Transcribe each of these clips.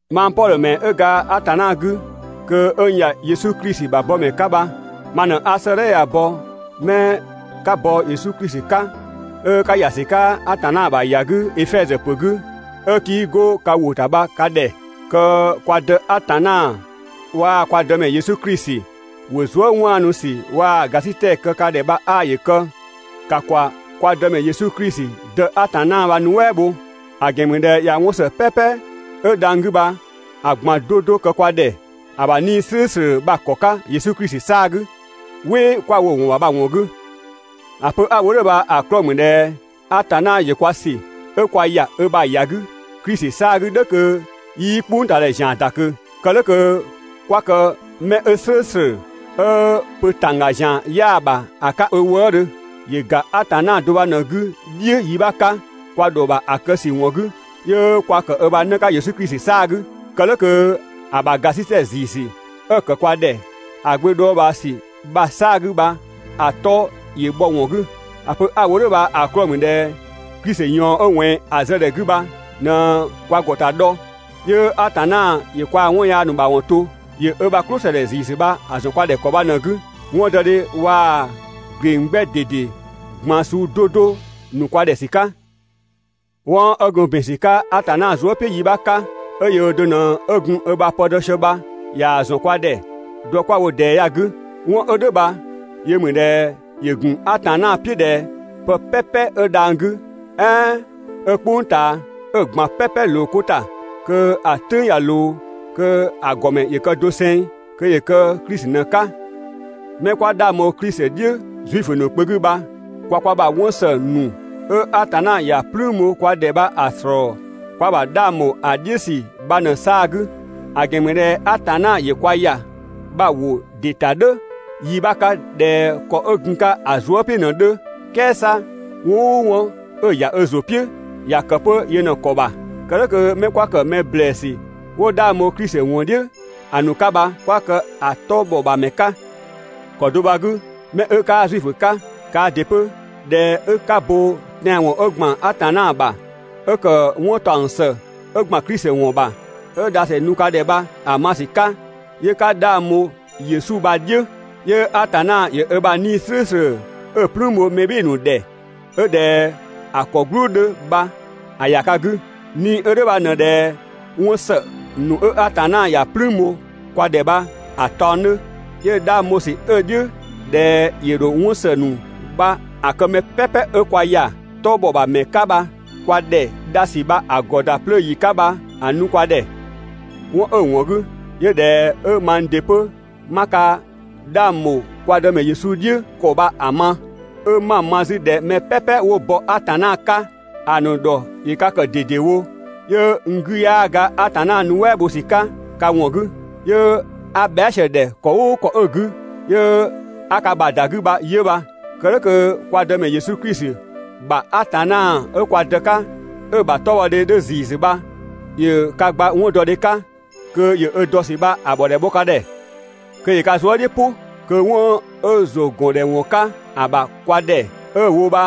Mang Pɔdhö ‑mɛ 'ö ga Atanna 'gü kö 'ö n ‑ya Yesu Klisi ‑bha bɔmɛ 'ka bha, ma ꞊në 'a 'sëëdhɛ ya‑ bɔ 'mɛ 'ö 'ka bɔ Yesu Klisi 'ka, 'ö 'ka ‑ya ‑sü 'ka Atanna ‑bha ‑ya 'gü Efɛzö ‑pö 'gü, 'ö 'kii 'go ka ‑wʋ ‑ta bha ka ‑dhɛ. Kö kwa Dë Atanna waa‑ kwa Dëmɛ Yesu Klisi ‑wo zuë" 'waanu ‑sü waa‑ ‑gasitɛ kë ka ‑dhɛ bha 'aa ‑yö kë. ‑Ka ‑kwa kwa Dëmɛ Yesu Klisi Dë Atanna bha‑ nuɛ" bho! ‑A ‑gɛn ‑mü ꞊dhɛ ꞊ya 'wɔn ‑së "pɛpɛ 'ö dhang‑ 'gü bha‑ ꞊gban 'do 'do kë kwa ‑dhɛ ‑a ‑bha 'Nii‑ "slʋ̈ʋ̈slʋ̈ bha‑ ‑kɔ 'ka Yesu Klisi 'saa‑ 'gü, "wɩ 'kwa‑ wo‑ ‑wɔn ‑bha bha‑ ‑wɔn 'gü. ‑A pö 'a‑ wo "dhʋ̈ bha‑ 'klɔɔ‑ ‑mü ꞊dhɛ Atanna ‑yö kwa ‑sü 'ö kwa ‑ya ö ‑bha ‑ya 'gü Klisi 'saa‑ 'gü "dhʋ̈ kö 'yii "kpʋngtaadhɛ ‑zian ‑da ꞊kö. Kë "dhʋ̈ kö 'kwa kë 'mɛ 'ö "slʋ̈ʋ̈slʋ̈, 'ö pö ‑tangga ‑zian 'yaa‑ ‑bha ‑a 'ka ö wëëdhö. ‑Yö ‑ga Atanna do bha ꞊në‑ 'gü "dhiʋ̈ yi 'bha 'ka, kwa ‑dhɔ ‑bha ‑a kë ‑sü ‑wɔn 'gü, 'yö kwa ‑kë ö ‑bha 'në 'ka Yesu Klisi 'saa‑ 'gü. Kë "dhʋ̈ kö ‑a ‑bha ‑gasitɛ ‑ziisü 'ö‑ ‑kë kwa ‑dhɛ ‑a Gbö dhɔɔbhaa ‑sü bha‑ 'saa‑ 'gü bha ‑a 'tɔ ‑yö bhɔ‑ ‑wɔn 'gü. ‑A pö 'a‑ wo "dhʋ̈ bha‑ 'klɔɔ‑ ‑mü ꞊dhɛ Klisi ꞊yɔɔn 'ö ꞊wɛnng‑ zë ‑dhɛ 'gü bha ꞊në kwa ‑gɔta dhɔ, 'yö Atanna ‑yö kwaa‑ 'wɔn yaa ‑nu ‑mawɔn to. ‑Yö ö ‑bha "klʋsëdhɛ ‑ziisü bha‑ ‑zɔn kwa ‑dhɛ ‑kɔ bha ꞊në‑ 'gü, 'wɔndɔdhe waa‑ ‑gleng 'gbɛ ꞊dede ꞊gban suu 'do 'do ‑nu kwa ‑dhɛ ‑sü 'ka. 'Wɔn 'ö gun ‑bin ‑sü 'ka Atanna zuë" "piʋ̈ yi 'bha 'ka, 'ö yöö do ꞊në gun ö ‑bha pë dɔ sië bha, ꞊yaa‑ ‑zɔn kwa ‑dhɛ dɔ 'kwa‑ wo ꞊dɛɛ ya‑ 'gü. 'Wɔn 'ö "dhʋ̈ bha yö ‑mü ꞊dhɛ ‑yö ‑gun Atanna "piʋ̈ ꞊dhɛ pë "pɛpɛ 'ö dhang‑ 'gü, "ɛɛn 'ö "kpʋng ꞊taa, 'ö‑ ꞊gban "pɛpɛ ꞊loo 'ko ‑ta kö ‑a "tʋ̈ng ꞊ya ꞊loo, kö‑ ‑gɔmɛ ‑yö kë doseng, kö ‑yö kë Klisi ꞊në‑ 'ka. 'Mɛ 'kwa 'dhang bho Klisi "dhiʋ̈ Zuifö ‑nu kpö 'gü bha kwa kwa ‑bha 'wɔn ‑së ‑nu 'ö Atanna ‑ya "plüün bho kwa ‑dhɛ bha‑ ‑slɔɔ kwa ‑bha 'dhang ‑bho ‑a "dhiʋ̈ ‑sü bha ꞊në 'saa‑ 'gü; ‑a ‑gɛn ‑mü ꞊dhɛ Atanna ‑yö kwa ‑ya bha‑ ‑wo ‑dɩ ‑ta "dhʋ̈ yi 'bha 'ka ꞊dhɛ ‑kɔ 'ö gun‑ 'ka‑ zuë" "piʋ̈ ꞊në‑ 'dhö, "kɛɛ 'sa 'wɔn "ʋʋ 'wɔn 'ö‑ ‑ya ö ‑zʋ "piʋ̈, ‑ya ‑kë 'pö yö ꞊në‑ ‑kɔ ‑bha. Kë "dhʋ̈ kö 'mɛ 'kwa ‑kë mɛ ‑blɛɛsü 'wo 'dhang bho Klisi ‑wɔn "dhiʋ̈ ‑a ‑nu 'ka bha 'kwa kë‑ 'tɔ ‑bhɔbhamɛ 'ka. ‑Kɔ do bha‑ 'gü, 'mɛ 'ö 'kaa Zuifö 'ka kaa ‑dɩ 'pö, ꞊dhɛ 'ö 'ka bo tɛanwɔn 'ö ‑gban Atanna ‑bha, 'ö ‑kë 'wɔn ‑taɔng ‑së 'ö ‑gban Klisi ‑wɔn ‑bha, 'ö dhasü nu ka ‑dhɛ bha‑ bha‑ ma ‑sü 'ka, 'yö 'ka 'dhang bho Yesu bha‑ "dhiʋ̈, 'yö Atanna ‑yö ö ‑bha 'Nii‑ "slʋ̈ʋ̈slʋ̈ 'ö‑ "plüün bho mɛ "bhɩɩ‑ ‑nu ‑dhɛ, 'ö ꞊dhɛ‑ ‑kɔ "gblʋʋ 'dhö bha‑ ‑ya ka 'gü. 'Nii‑ 'ö "dhʋ̈ bha ꞊në ꞊dhɛ 'wɔn ‑së ‑nu 'ö Atanna ‑ya "plüün bho kwa ‑dhɛ bha‑ taɔng 'dhö, 'yö 'dhang bho ‑sü 'ö‑ "dhiʋ̈ ꞊dhɛ ‑yö ‑dho 'wɔn ‑së ‑nu bha‑ kë mɛ "pɛpɛ 'ö kwa ‑ya ö 'tɔbhɔbhamɛ 'ka bha kwa ‑dhɛ dhasü bha‑ ‑gɔ ‑da 'plöö ‑yi 'ka bha‑ nu kwa ‑dhɛ. 'Wɔn 'ö‑ ‑wɔn 'gü 'yö ꞊dhɛ 'ö mang ‑dɩ 'pö 'ma ka 'dhang ‑bho kwa Dëmɛ Yesu "dhiʋ̈ ‑kɔ bha‑ ma, 'ö 'ma‑ ma 'zü ꞊dhɛ mɛ "pɛpɛ 'wo bɔ Atanna 'ka ‑a ‑nu ‑dhɔ ‑yö ka ‑kë ꞊dedewo, 'yö n 'gü 'yaa ga Atanna nuɛ" bho ‑sü 'ka ka ‑wɔn 'gü, 'yö 'a bhɛa" sië‑ ‑dhɛ ‑kɔ "ʋʋ ‑kɔ 'ö‑ 'gü 'yö 'a ka ‑bha ‑da 'gü bha 'yö bha. Kë "dhʋ̈ kö kwa Dëmɛ Yesu Klisi ‑bha Atanna 'ö kwa Dë 'ka 'ö‑ ‑bha 'tɔbhɔdhe 'dhö ‑ziisü bha ‑yö ka gba 'wɔndɔdhe 'ka, kö ‑yö ö dɔ ‑sü bha‑ ‑bhɔdhɛ bhɔ ka ‑dhɛ, kö ‑yö ka zuë" "dhiʋ̈ "pʋ, kö 'wɔn 'ö ‑zʋgɔndhɛwɔn 'ka ‑a ‑bha kwa ‑dhɛ 'ö‑ wo bha‑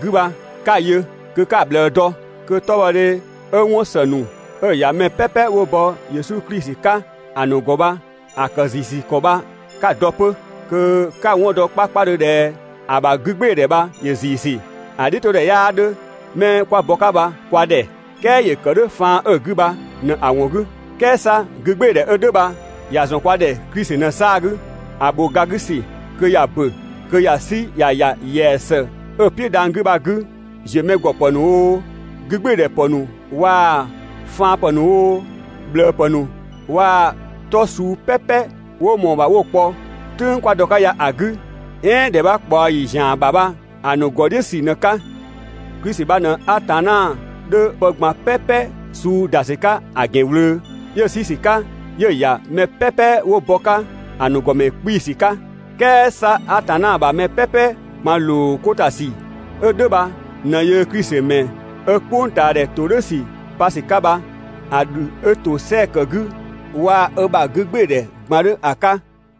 'gü bha, 'ka‑ yö kö 'ka‑ ꞊bhlëë dɔ, kö 'tɔbhɔdhe 'ö 'wɔn ‑së ‑nu 'ö‑ ‑ya mɛ "pɛpɛ 'wo bɔ Yesu Klisi 'ka ‑a ‑nu ‑gɔ bha‑ ‑kë ‑ziisü ‑kɔ bha 'ka‑ dɔ 'pö kö 'ka‑ 'wɔn dɔ 'pö 'kpakpadhö ꞊dhɛ ‑a ‑bha 'gügbɩɩdhɛ bha ‑yö ‑ziisü, ‑a "dhiʋ̈todhɛ 'yaa 'dhö 'mɛ 'kwa bɔ‑ 'ka bha kwa ‑dhɛ, "kɛɛ ‑yö ‑kë "dhʋ̈ faan 'ö‑ 'gü bha ꞊në‑ ‑wɔn 'gü. "Kɛɛ 'sa 'gügbɩɩdhɛ 'ö "dhʋ̈ bha ‑ya ‑zɔn kwa ‑dhɛ Klisi ꞊në‑ 'saa‑ 'gü, ‑a ‑bho ga 'gü ‑sü kö ‑ya ‑bö, kö ‑ya 'sü ‑ya ‑ya ‑yɛa ‑së 'ö‑ "piʋ̈ dhang‑ 'gü bha‑ 'gü, ‑ziömɛgɔpë ‑nu oo, 'gügbɩɩdhɛ ‑pë ‑nu waa‑ faanpë ‑nu oo, ꞊bhlëë ‑pë ‑nu waa‑ 'tɔ suu "pɛpɛ 'wo ꞊mɔɔ‑ ‑bha 'wo‑ kpɔ "tʋ̈ng 'kwa dɔ‑ 'ka ya‑ 'gü, "ɛɛn ‑dhɛ 'bha ꞊kpaɔ ‑yi ‑zian ‑bha bha‑ ‑nu ‑gɔ "dhiʋ̈ ‑sü ꞊në‑ 'ka. Klisi bha ꞊në Atanna 'dhö pë ꞊gban "pɛpɛ suu ‑da ‑sü 'ka‑ ‑gɛn ꞊wlöö, 'yö‑ 'sü ‑sü 'ka 'yö‑ ‑ya mɛ "pɛpɛ 'wo bɔ‑ 'ka ‑a ‑nu ‑gɔmɛ 'kpii‑ ‑sü 'ka. "Kɛɛ 'sa Atanna ‑bha mɛ "pɛpɛ ꞊gban ‑loo 'ko ‑ta ‑sü 'ö "dhʋ̈ bha ꞊në ꞊dhɛ yöö Klisi ‑mɛ 'ö "kpʋngtaadhɛ ‑todhʋ̈sü pa ‑sü 'ka bha‑ ‑dhü 'ö ‑tosɛa ‑kë 'gü waa‑ ö ‑bha 'gügbɩɩdhɛ ꞊gban 'dhö ‑a 'ka.